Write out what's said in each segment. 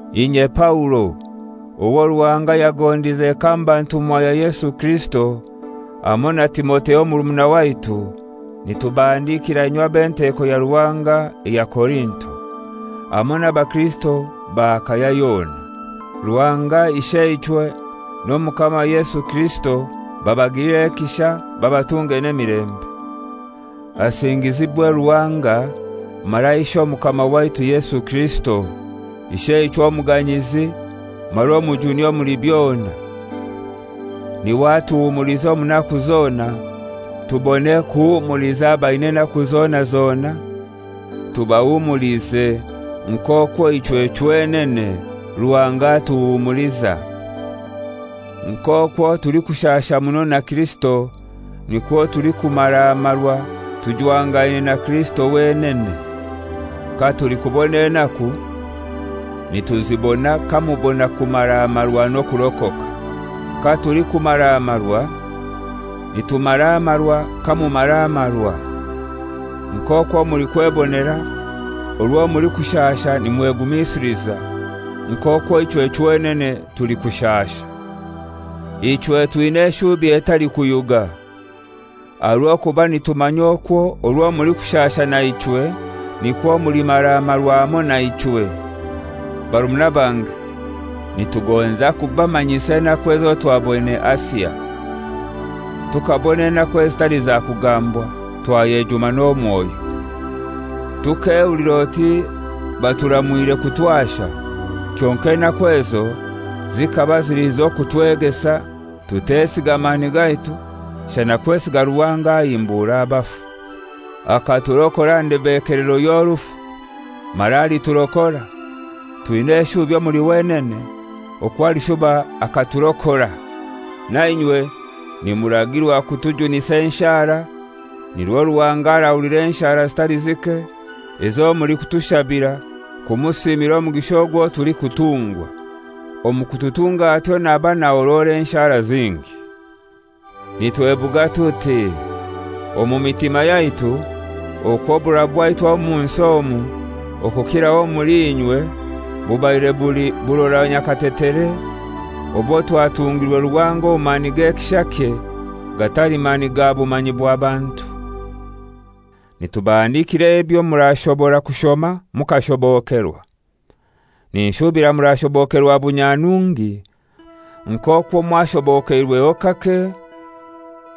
Inye Paulo, owo Ruhanga yagondize kamba ntumwa ya Yesu Kirisito, hamoi na Timotheo murumuna waitu, nitubahandikira inywe ab'enteko ya Ruhanga eya Korinto, hamoi n'abakirisito ba Akaya yona: Ruhanga Isheichwe n'Omukama Yesu Kirisito babagilire ekisha babatunge n'emilembe. Agingizibwe Ruhanga mara Ishe Omukama waitu Yesu Kirisito, Isheichwe omuganyizi mara omujuni omuli byona. N'iwe atuhumuliza omu naku zona, tubone kuhumuliza abaina enaku zona zona, tubahumulize nk'okwo ichwe chwenene Ruhanga atuhumuliza. Nk'okwo tulikushasha muno na Kirisito, nikwo tulikumara marwa tujwangaine na Kirisito wenene. Katulikubona enaku, nituzibona kamubona kumaramarwa n'okurokoka. Katulikumaramarwa, nitumaramarwa kamumaramarwa, nk'okwo mulikwebonera orwo mulikushasha nimwegumisiliza nk'okwo ichwe chwenene tulikushasha. Ichwe twina eshubi etalikuyuga. Aha rw'okuba nitumanya okwo orwo mulikushasha naichwe, nikwo mulimaramarwa hamoi naichwe. Barumuna bange, nitugonza kubamanyisa enaku ezo twaboine Asia. Tukabona enaku ezitali za kugambwa, twayejuma n'omwoyo. Tukehulira oti baturamwire kutwasha; kyonkai enaku ezo zikaba zili z'okutwegesa tutesiga mani gaitu, shana kwesiga Ruhanga ahimbura abafu. Akaturokora aha ndebekelero y'orufu; mara aliturokora; twina eshubi omuli wenene okwo alishuba akaturokore. Na inywe nimuragirwa kutujunisa enshara nirwo Ruhanga arahulira enshara zitali zike ezo mulikutushabira kumusiimira omugisha ogwo tulikutungwa; omu kututunga atyo naba nahorora enshara zingi. Nitwebuga tuti: Omu mitima yaitu okwo oburora bwaitu omu nsi omu, okukiraho omuli inywe, bubaire buli burora nyakatetere obwo twatungirwe Ruhanga omu mani g'ekishakye, gatali mani ga bumanyi bwa bantu. Nitubahandikira ebyo murashobora kushoma mukashobokerwa. Ninshubira murashobokerwa bunyanungi, nk'okwo mwashobokeirweho kake,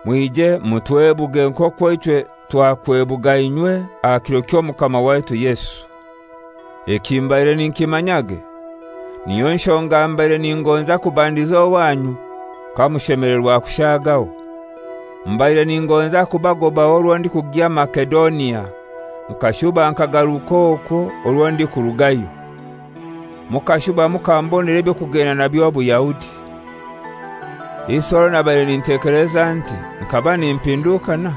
mwije mutwebuge nk'okwo ichwe twakwebuga inywe aha kiro ky'Omukama waitu Yesu. Eki mbaire ninkimanyage, niyo nshonga mbaire ningonza kubandiza owanyu kamushemelerwa kushagaho. Mbaire ningonza kubagobaho orwo ndikugya Masedonia, nkashuba nkagaruka okwo orwo ndikurugayo, mukashuba mukambonera eby'okugenda nabyo Buyahudi. Isi orwo nabaire nintekeleza nti nkaba nimpindukana?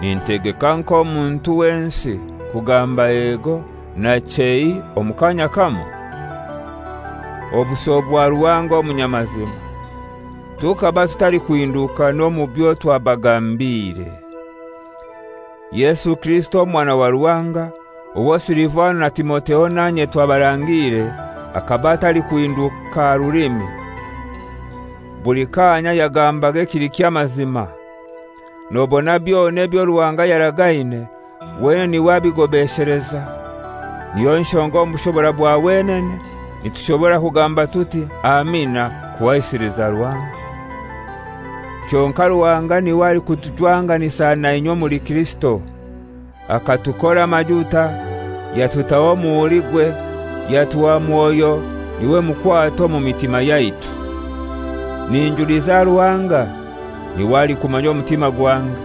Nintegeka nk'omuntu wensi, kugamba «Ego» na «Chei» omu kanya kamoi? Obuso bwa Ruhanga omunyamazima, tukaba tutalikuhindukana omu byo twabagambiire. Yesu Kirisito Omwana wa Ruhanga, owo Silivano na Timotheo nanye twabarangiire akaba atalikuhinduka aha rulimi. Buli kanya yagambaga ekili ky'amazima. Nobona byona ebyo Ruhanga yaragaine, wenene n'iwe abigobesheleza. Niyo nshonga omu bushobora bwa wenene nitushobora kugamba tuti, «Amina» kuhaisiliza Ruhanga. Kyonkai Ruhanga n'iwe alikutujwanganisa na inywe omuli Kirisito: Akatukora amajuta, yatutaho omuhurigwe, yatuha Mwoyo, n'iwe mukwato omu mitima yaitu. Ninjuliza Ruhanga, n'iwe alikumanya omutima gwange!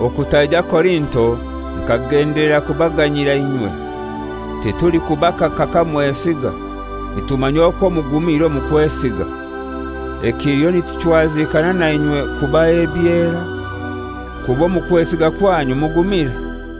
Okutaija Korinto nkagendelera kubaganyira inywe. Titulikubakaka kamwesiga; nitumanya okwo mugumire omu kwesiga. Ekiliho nituchwazikana na inywe kubaha ebyera, kuba omu kwesiga kwanyu mugumire.